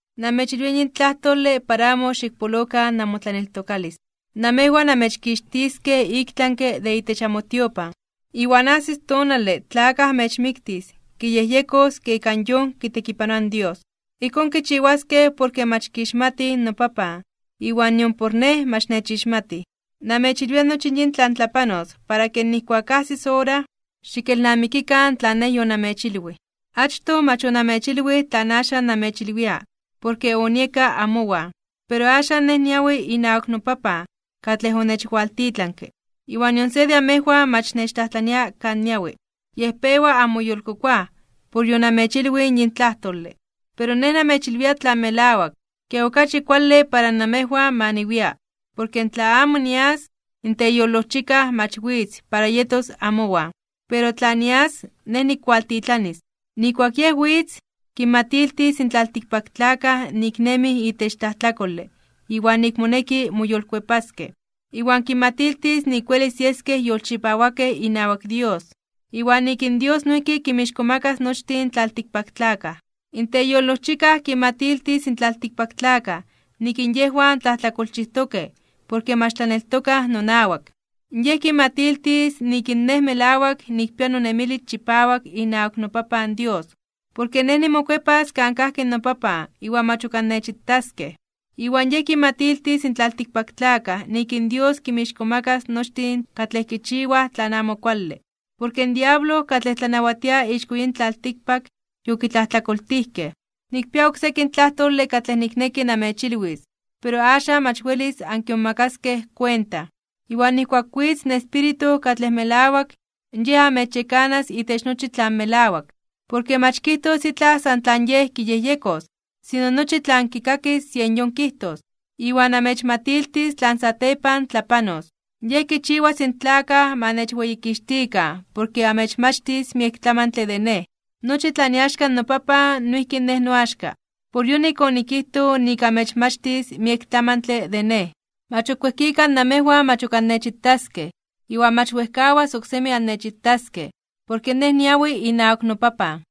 ’Namechilwia yin tlajtole para amo xikpolokan namotlaneltokalis. Namejwan amechkixtiskej iktlanke (ik tlami) de itech amotiopan, iwan ajsis tonale tla akaj amechmiktis kiyejyekos ke ika yon kitekipanoa in Dios. Ijkón kichiwaskej porke mach kixmatij noPapan iwan nion Nej mach nechixmatij. Namechilwia nochi yin tlan tlapanos para ke nijkuak ajsis ora, xikelnamikikan tlan Nej yonamechilwij. ’Achtoj mach onamechilwij tlan axan namechilwia, porke onieka amowan. Pero axan Nej niawi inawak noPapan katlej onechwaltitlanke. Iwan nion se de amejwan mach nechtlajtlania kan niawi. Yej pewa anmoyolkokoaj por yonamechilwij yin tlajtole. Pero Nej namechilwia tlan melawak, ke okachi kuale para namejwan ma niwia. Porke tla amo nias, in Teyolojchikaj mach witz para yetos amowan. Pero tla nias, Nej nikkualtitlanis. Nijkuak Yej witz, kinmatiltis in tlaltikpaktlakaj nik nemij itech tlajtlakole iwan nik moneki moyolkuepaskej, iwan kinmatiltis nik welis yeskej yolchipawakej inawak Dios, iwan nik in Dios noijki kinmixkomakas nochtin in tlaltikpaktlakaj. In Teyolojchikaj kinmatiltis in tlaltikpaktlakaj nik in yejwan tlajtlakolchijtokej porke mach tlaneltokaj nonawak. Yej kinmatiltis nik in Nej melawak nikpia nonemilis chipawak inawak noPapan Dios, porke Nej nimokuepas kan kajki noPapan iwan mach ok annechitaskej. Iwan Yej kinmatiltis in tlaltikpaktlakaj nik in Dios kinmixkomakas (kintzonmanas) nochtin katlej kichiwaj tlan amo kuale, porke in diablo, katlej tlanawatia ixko yin tlaltikpak, yokitlajtlakoltijkej. ’Nikpia ok sekin tlajtole katlej nikneki namechilwis, pero axan mach welis ankimomakaskej kuenta. Iwan nijkuak witz in Espíritu katlej melawak, Yej amechyekanas itech nochi tlan melawak. Porke mach kijtos itlaj san tlan Yej kiyejyekos, sino nochi tlan kikakis yen yon kijtos. Iwan amechmatiltis tlan satepan tlapanos. Yej kichiwas in tlakaj ma nechweyikixtikan porke amechmachtis miek tlamantle de Nej. Nochi tlan iaxka noPapan noijki Nej noaxka. Por yonik onikijtoj nik amechmachtis miek tlamantle de Nej. ’Mach ok wejkika namejwan mach ok annechitaskej, iwan mach wejkawas oksemi annechitaskej, porke Nej niawi inawak noPapan.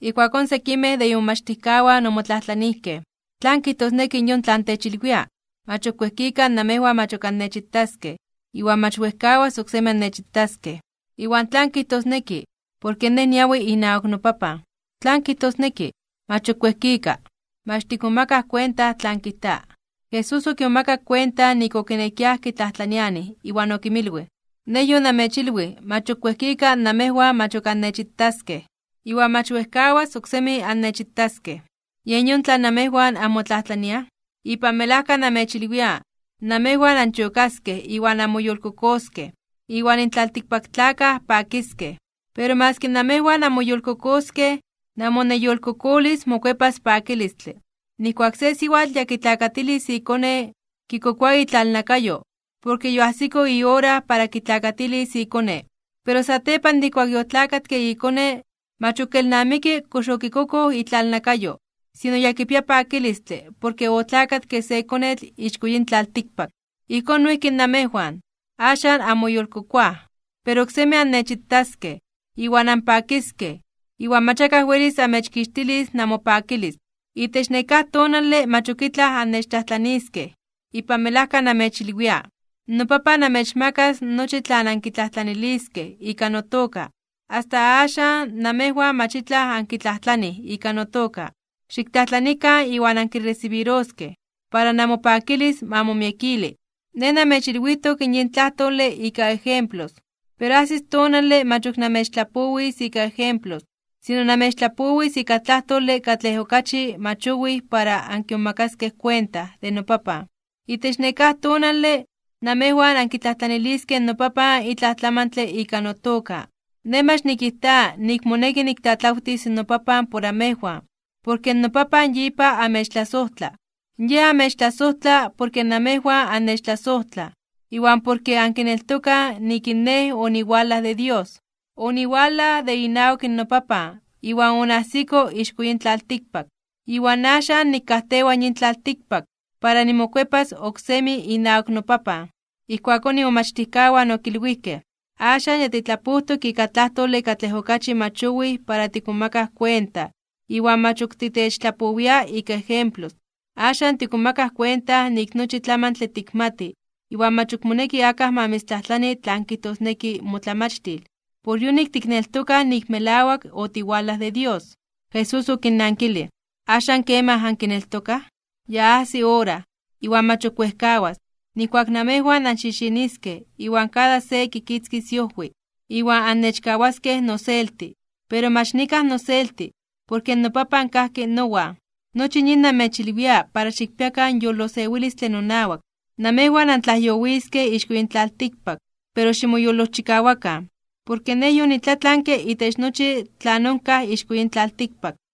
Ijkuakón sekimej de imomachtijkawan omotlajtlanijkej: ―¿Tlan kijtosneki yon tlan techilwia: “Mach ok wejkika namejwan mach ok annechitaskej, iwan mach wejkawas oksemi annechitaskej”, iwan tlan kijtosneki: “Porke Nej niawi inawak noPapan”? ¿Tlan kijtosneki: “Mach ok wejkika”? Mach tikmomakaj kuenta tlan kijta. Jesús okimomakak kuenta nik okinekiaj kitlajtlanianij, iwan okinmilwij: ―Nej yonamechilwij mach ok wejkika namejwan mach ok annechitaskej, iwan mach wejkawas oksemi annechitaskej. ¿Yen yon tlan namejwan anmotlajtlaniaj? Ipan melajka namechilwia, namejwan anchokaskej iwan anmoyolkokoskej, iwan in tlaltikpaktlakaj pakiskej. Pero maski namejwan anmoyolkokoskej, namoneyolkokolis mokuepas pakilistle. Nijkuak se siwatl ya kitlakatilis ikone, kikokoa itlalnakayo, porke yoajsiko iora para kitlakatilis ikone. Pero satepan de ijkuak yotlakatke ikone, mach ok kelnamiki kox okikokoj itlalnakayo, sino ya kipia pakilistle porke otlakatke se konetl ixko yin tlaltikpak. Ijkón noijki namejwan, axan anmoyolkokoaj. Pero oksemi annechitaskej, iwan anpakiskej, iwan mach akaj welis amechkixtilis namopakilis. ’Itech nekáj tonale mach ok itlaj annechtlajtlaniskej. Ipan melajka namechilwia, noPapan amechmakas nochi tlan ankitlajtlaniliskej ika notoka. Asta axan, namejwan mach itlaj ankitlajtlanij ika notoka. Xiktlajtlanikan iwan ankiresibiroskej, para namopakilis ma momiekili. ’Nej namechilwijtok yin tlajtole ika ejemplos. Pero ajsis tonale mach ok namechtlapowis ika ejemplos, sino namechtlapowis ika tlajtole katlej okachi mach owij para ankimomakaskej kuenta de noPapan. Itech nekáj tonale, namejwan ankitlajtlaniliskej noPapan itlaj tlamantle ika notoka. Nej mach nikijta nik moneki niktlatlawtis noPapan por amejwan, porke noPapan yipa amechtlasojtla. Yej amechtlasojtla porke namejwan annechtlasojtlaj, iwan porke ankineltokaj nik in Nej oniwalaj de Dios. Oniwalaj de inawak noPapan iwan onajsiko ixko yin tlaltikpak. Iwan axan nikajtewa yin tlaltikpak para nimokuepas oksemi inawak noPapan. Ijkuakón imomachtijkawan okilwijkej: ―Axan ya titlapojtok ika tlajtole katlej okachi mach owij para tikmomakaj kuenta iwan mach ok titechtlapoawia ika ejemplos. Axan tikmomakaj kuenta nik nochi tlamantle tikmati, iwan mach ok moneki akaj ma mitztlajtlani tlan kijtosneki motlamachtil. Por yonik tikneltokaj nik melawak otiwalaj de Dios. Jesús okinnankilij: ―¿Axan kemaj ankineltokaj? Ya ajsi ora, iwan mach ok wejkawas, nijkuak namejwan anxixiniskej iwan kada se kitzkis iojwi, iwan annechkawaskej noselti. Pero mach nikaj noselti, porke noPapan kajki nowan. Nochi yin namechilwia para xikpiakan yolosewilistle nonawak. Namejwan antlajyowiskej ixko yin tlaltikpak, pero ximoyolojchikawakan, porke Nej yonitlatlanke itech nochi tlan onkaj ixko yin tlaltikpak.